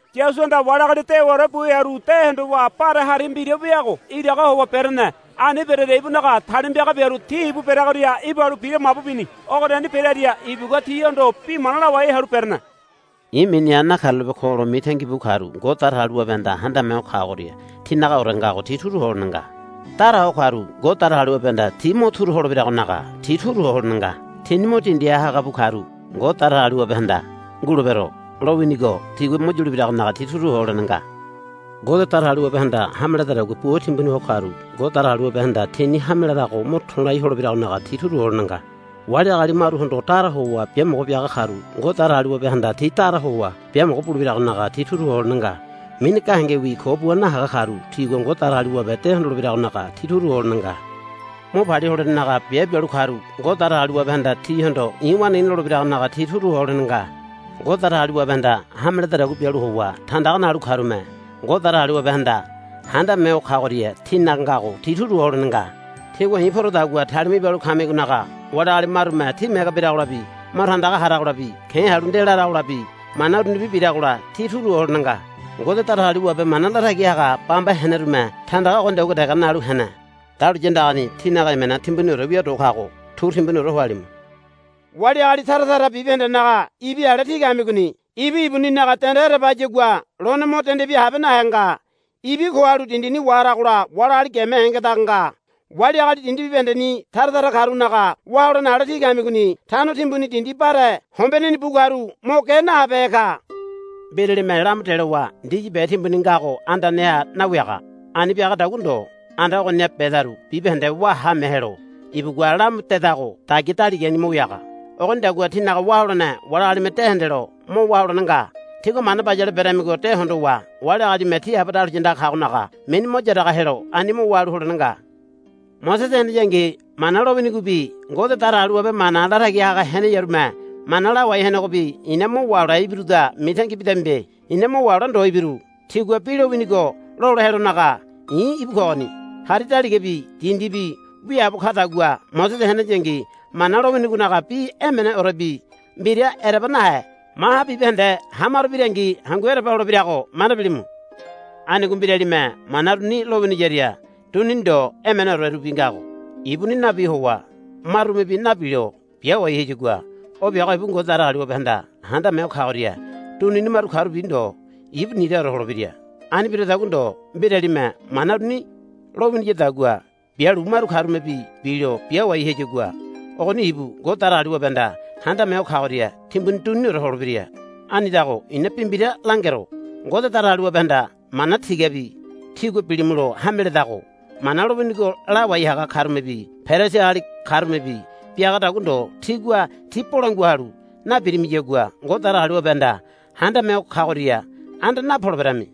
Yasuhanda wali agali dewaore bu hearu de hondowa bare hari mbira weago iraga howa berene. Ani berearia ibunaga talima piaga biaru ti ibu bereagoria ibalu bira mabu bini. Ogoriani berearia ibugua tihondo bi mana lawai halu berene. I̱ miniha nakarulape ko lo mitangi bu karu Ngode Datagaliwabehanda Handame Ho Kagoria tinagaore ngago ti turu ho holene nga. Dara ho karu Ngode Datagaliwabehanda ti mo turu holebiragonaga ti turu ho holene nga. Tini mo dindiha haga bu karu Ngode Datagaliwabehanda, Ngulebero, lowinigo tigua mo yulebiragonaga ti turu ho holene nga. Ngode Datagaliwabehanda hame ledadagua bua timbuni ho karu Ngode Datagaliwabehanda tini hame larago mo to̱lai holebiragonaga ti turu ho holene nga. Wali agali maruhondo dara howa biamogo biaga karu Ngode Datagaliwabehanda ti dara howa biamogo bulebiragonaga ti turu ho holene nga. Mini gahengewi ko bua nahaga karu tigua Ngode Datagaliwabe de hondolebiragonaga ti turu ho holene nga. Mo palia holenenaga biabe bialu karu Ngode Datagaliwabehanda tihondo, I̱ waneigini, lolebiragonaga ti turu ho holene nga. Ngode Datagaliwabehanda hame ledadagua bialu howa tandaga nalu karume Ngode Datagaliwabehanda Handame Ho Kagoria tinaga ngago ti turu ho holene nga. Tígua i̱ porodagua talima ibalu kamigonaga wali agali marume tí mege biragolabi mo tandaga haragolabi ke̱ halu nde laragolabi mana urunibi biragola tí turu ho holene nga. Ngode Datagaliwabe mana latagi haga bamba henerume tandaga ogonidagua dege nalu hene. Dahuliya andagani tínaga emena timbuniore wia do kago turu timbuniore ho halimu. Wali agali tara tara bibahendenaga ibi ale tí kamigoni. Ibi ibuninaga dende ereba hayagua lone mo dende bia habe nahe nga. Ibi ko halu dindini waharagola wali agali geme hengedaga nga. Wali agali dindi bibahendeni tara tara karunaga wá holene ale tí kamigoni. Tano timbuni dindi bare hombeneni bu karu mo ge nahabehe ka. Mbiralime lamu delowa ndisi be timbuni ngago andaneha nawiaga. Ani biagadagua ndo anda ogoniha bedaru bibahende wá haame helo ibugua lamu dedago dagia daligani mo wiaga. Ogonidagua tínaga wá holene wali agalime de hendelo mo wá holene nga. Tígua mana bayale beramigo de hondowa wali agalime tí Aba dahuliya andaga kagonaga mini yaraga helonaga ani mo wá halu holene nga. Mosese heneyangi Mana lowinigobi Ngode Datagaliwabe mana latagi haga heneyarume mana lawai henegobi i̱na mo wahole ibiruda mitangi bidamibe. I̱na mo wahole ndo ibiru. Tigua bi lowinigo lola helonaga i̱ íbu kogoni. Hari daligabi dindibi wiaabo kadagua Mosese heneyangi Mana lowinigonaga bi emeneorebi mbira ereba nahe maha bibahende hamaro birangi hangu ereba holebirago manda bilimu. Anigo mbiralime mana uruni lowiniyaria dunini ndo emeneorerubi ngago ibuni nabi howa marumebi nabilo biawai hayagua o biago ibu Ngode Datagaliwabehanda Handame Ho Kagoria dunini maru karubi ndo ibu niraore holebira. Ani biradagua ndo mbiralime mana uruni lowiniyadagua bialu maru karumebi bilo biawai hayagua ogoni ibu Ngode Datagaliwabehanda Handame Ho Kagoria timbuni duniniore holebira. Anidago i̱na bi mbira langero. Ngode Datagaliwabehanda mana tigabi tígua bilimulo hame ledago Mana lowinigo lawai haga karumebi Perisi agali karumebi biagadagua ndo tígua ti bolangua halu nabirimiyagua Ngode Datagaliwabehanda Handame Ho Kagoria anda napoleberami.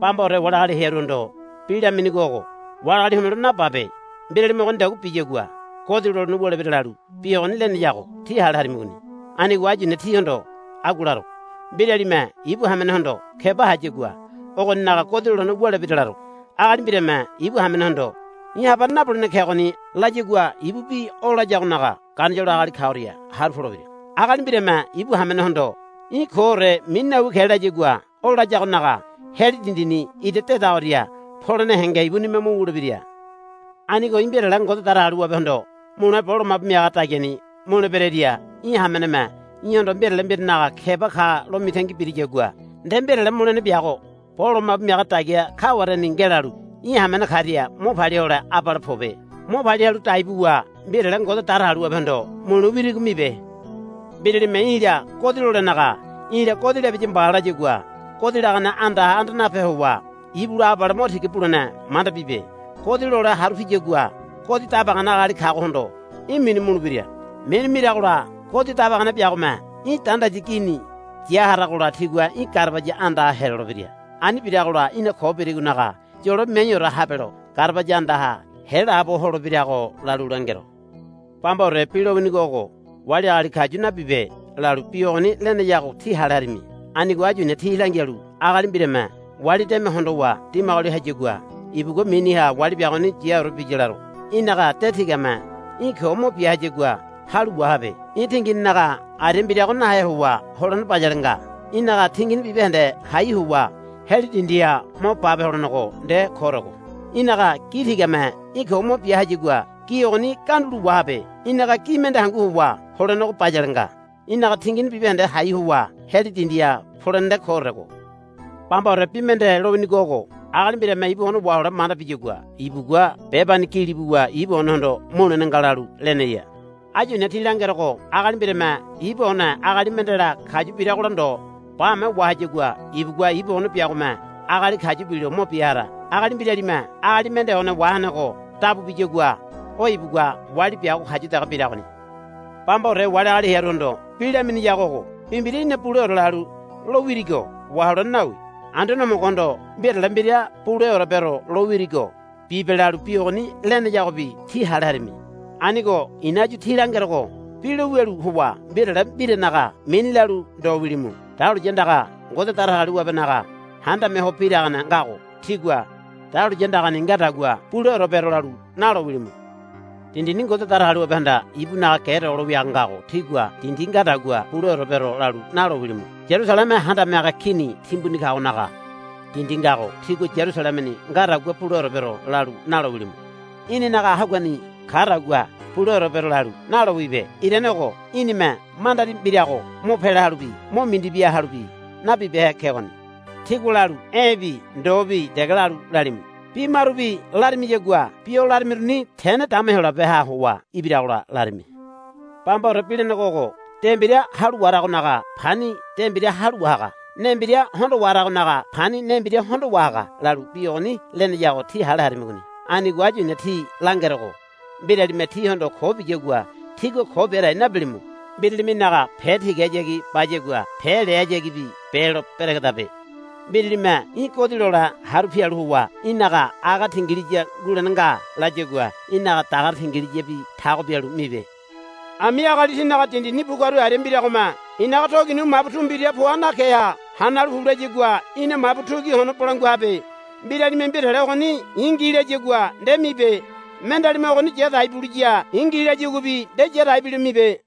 Bambaore wali agali hearuhondo bi laminigo ogo, Wali agali homelo nababe. Mbiralime ogonidagua biyagua godi lolene wulebira, lalu bi ogoni leneyago tí hale harimigoni. Anigo áyu i̱na tíhondo agua laro. Mbiralime ibu hamenehondo keba hayagua ogoninaga godi lolene wulebira laro. Agali mbirame ibu hamenehondo, Í̠ habane nabulene kegoni, layagua ibubi o layagonaga ganisolo agali kagoria haru polebira. Agali mbirame ibu hamenehondo, Í̠ koore mini nawi ke, layagua o layagonaga heli dindini ira dedagoria polene henge ibunime mo wulebira. Anigo í̠ mbirale Ngode Datagaliwabehondo mule bo lomabu miaga dagiani mule bereria í̠ hameneme í̠hondo mbirale mbiranaga keba ka lo mitangi biriyagua nde mbirale mulene biago bo lomabu miaga dagia kawareni ngelalu í̠ hamene karia mo palia hole abale pobe. Mo palia halu dai buwa mbirale Ngode Datagaliwabehondo mule wirigo mibe. Mbiralime í̠la godi lolenaga, I̱la godi labiya mba, layagua godi lagane andaha anda nape howa ibula abale mo tiga bulene manda bibe. Godi lole haru piyagua godi dabagane agali kagohondo í̠ minu mulebira. Minu miragola godi dabagane biagome í̠ dandayi gini ya haragola tigua í̠ garabaya andaha helolebira. Ani biragola í̠na ko birigonaga yolo miaiore habelo garabaya andaha helaabo holebirago lalu langero. Bambaore bi lowinigo ogo, Wali agali kayu nabibe, lalu bi ogoni leneyago tí hale harimi. Anigo áyu i̱na tí langialu agali mbirame wali deme hondowa dimagoli hayagua ibugua miniha wali biagoni yaore biya laro. Í̠naga de tigame í̠ ko mo bia hayagua halu wahabe. Í̠ tingininaga aria mbirago nahe howa holene bayale nga. Í̠naga tingini bibahende hai howa heli dindiha mo bape holenego nde koorego. Í̠naga gi tigame í̠ ko mo bia hayagua gi ogoni gandulo wahabe. Í̠naga gi mende hangu howa holenego bayale nga. Í̠naga tingini bibahende hai howa heli dindiha polene nde koorego. Bambaore bi mende lowinigo ogo, Agali mbirame ibu one wahole manda biyagua ibugua bebani gili buwa ibu onehondo mulene nga, lalu leneya. Áyu i̱na tí langerogo agali mbirame ibu one agali mendela kayu biragola ndo bame wahayagua ibugua ibu one biagome agali kayu bilo mo bia hara. Agali mbiralime agali mende one wahenego dabu biyagua o ibugua wali biago kayu dege biragoni. Bambaore wali agali hearuhondo bi laminiyago ogo, Bi mbira í̠na buleore lalu lo wirigo waholene nawi. Anduane Homogohondo mbirale mbira buleore bero lo wirigo bibe, lalu bi ogoni leneyagobi tí hale harimi. Anigo i̱na áyu tí langerogo bi lo wialu howa mbirale mbiranaga mini lalu ndo wilimu. Dahuliya andaga Ngode Datagaliwabenaga handame ho biragane ngago tígua, Dahuliya andani ngadagua buleore bero, lalu nalo wilimu. Dindini Ngode Datagaliwabehanda ibunaga ge dogolo wiaga ngago tígua, Dindi ngadagua buleore bero, lalu nalo wilimu. Yarusaleme handame haga kini timbuni kagonaga dindi ngago tígua, Yarusalemeni ngadagua buleore bero, lalu nalo wilimu. Í̠ninaga haguani kadagua buleore bero, lalu nalo wibe. Irane ogo í̠nime mandari mbirago mo pela halubi mo mindi bia halubi nabibehe kegoni. Tígua lalu, E̱bi ndobi dege lalu lalimu. Bi marubi larimiyagua bi o larimiruni tene dama Heyolabeha howa ibiragola larimi. Bambaore bi lenego ogo, De mbira halu waharagonaga pani de mbira halu wahaga. Ne mbira hondo waharagonaga pani ne mbira hondo wahaga, lalu bi ogoni leneyago tí hale harimigoni. Anigo áyu i̱na tí langerogo mbiralime tíhondo ko biyagua tígua ko bia dai nabilimu. Mbiralime í̠naga pe tigahayagi bayagua pe lehayagibi belo beregedabe. Mbiralime í̠ godi lole haru pialu howa í̠naga aga tingiliya ngulene nga layagua í̠naga dagare tingiliyabi tago bialu mibe. Ami agali tínaga dindini bu karu aria mbiragome, I̱naga togi nu mabu tu mbira poa nakeha hanalu pu layagua í̠na mabu tu ki hono bolangua habe. Mbiralime, Mbirale ogoni i̱ ngi, layagua nde mibe. Mendealime, Ogoni ya dai buliya i̱ ngi, layaguabi nde ya dai bilo mibe.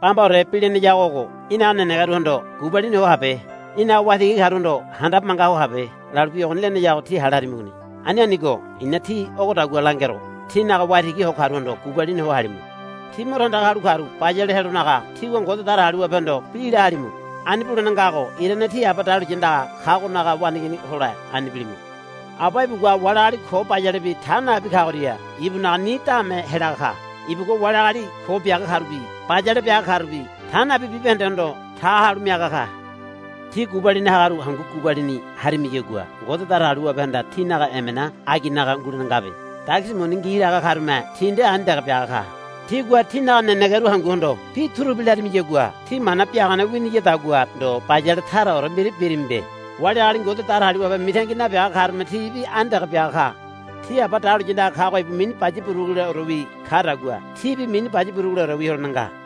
Bambaore bi leneyago ogo, Í̠naga nenegeruhondo gubalini ho habe. Í̠naga waitigi karuhondo handabe manga ho habe, lalu bi ogoni leneyago tí hale harimigoni. Ani anigo i̱na tí ogodagua langerogo tínaga waitigi ho karuhondo gubalini ho halimu. Tí mo tandaga halu karu bayale helonaga tígua Ngode Datagaliwabehondo bi la halimu. Ani bulene ngago irane tí Aba dahuliya andaga kagonaga waneigini hole ani bilimu. Aba ibugua wali agali ko bayalebi ta nabi kagoria ibunaga ni daame helaga ka. Ibugua wali agali ko biaga karubi bayale biaga karubi ta nabi bibahendehondo ta halu miaga ka. Tí gubalini hagaru hangu gubalini harimiyagua Ngode Datagaliwabehanda tínaga emena aginaga ngulene ngabe. Dagisi muni ngi laga karume ti nde ani dege biaga ka. Tígua tínaga nenegeru hanguhondo bi turubi larimiyagua tí mana biagane winiyadagua ndo bayale taraore mbira birimibe. Wali agali Ngode Datagaliwabe mitangi nabiaga karume tibi ani dege biaga ka. Tí Aba dahuliya andaga kago ibu mini baya buruguleorewi kadagua tíbi mini baya buruguleorewi holene nga.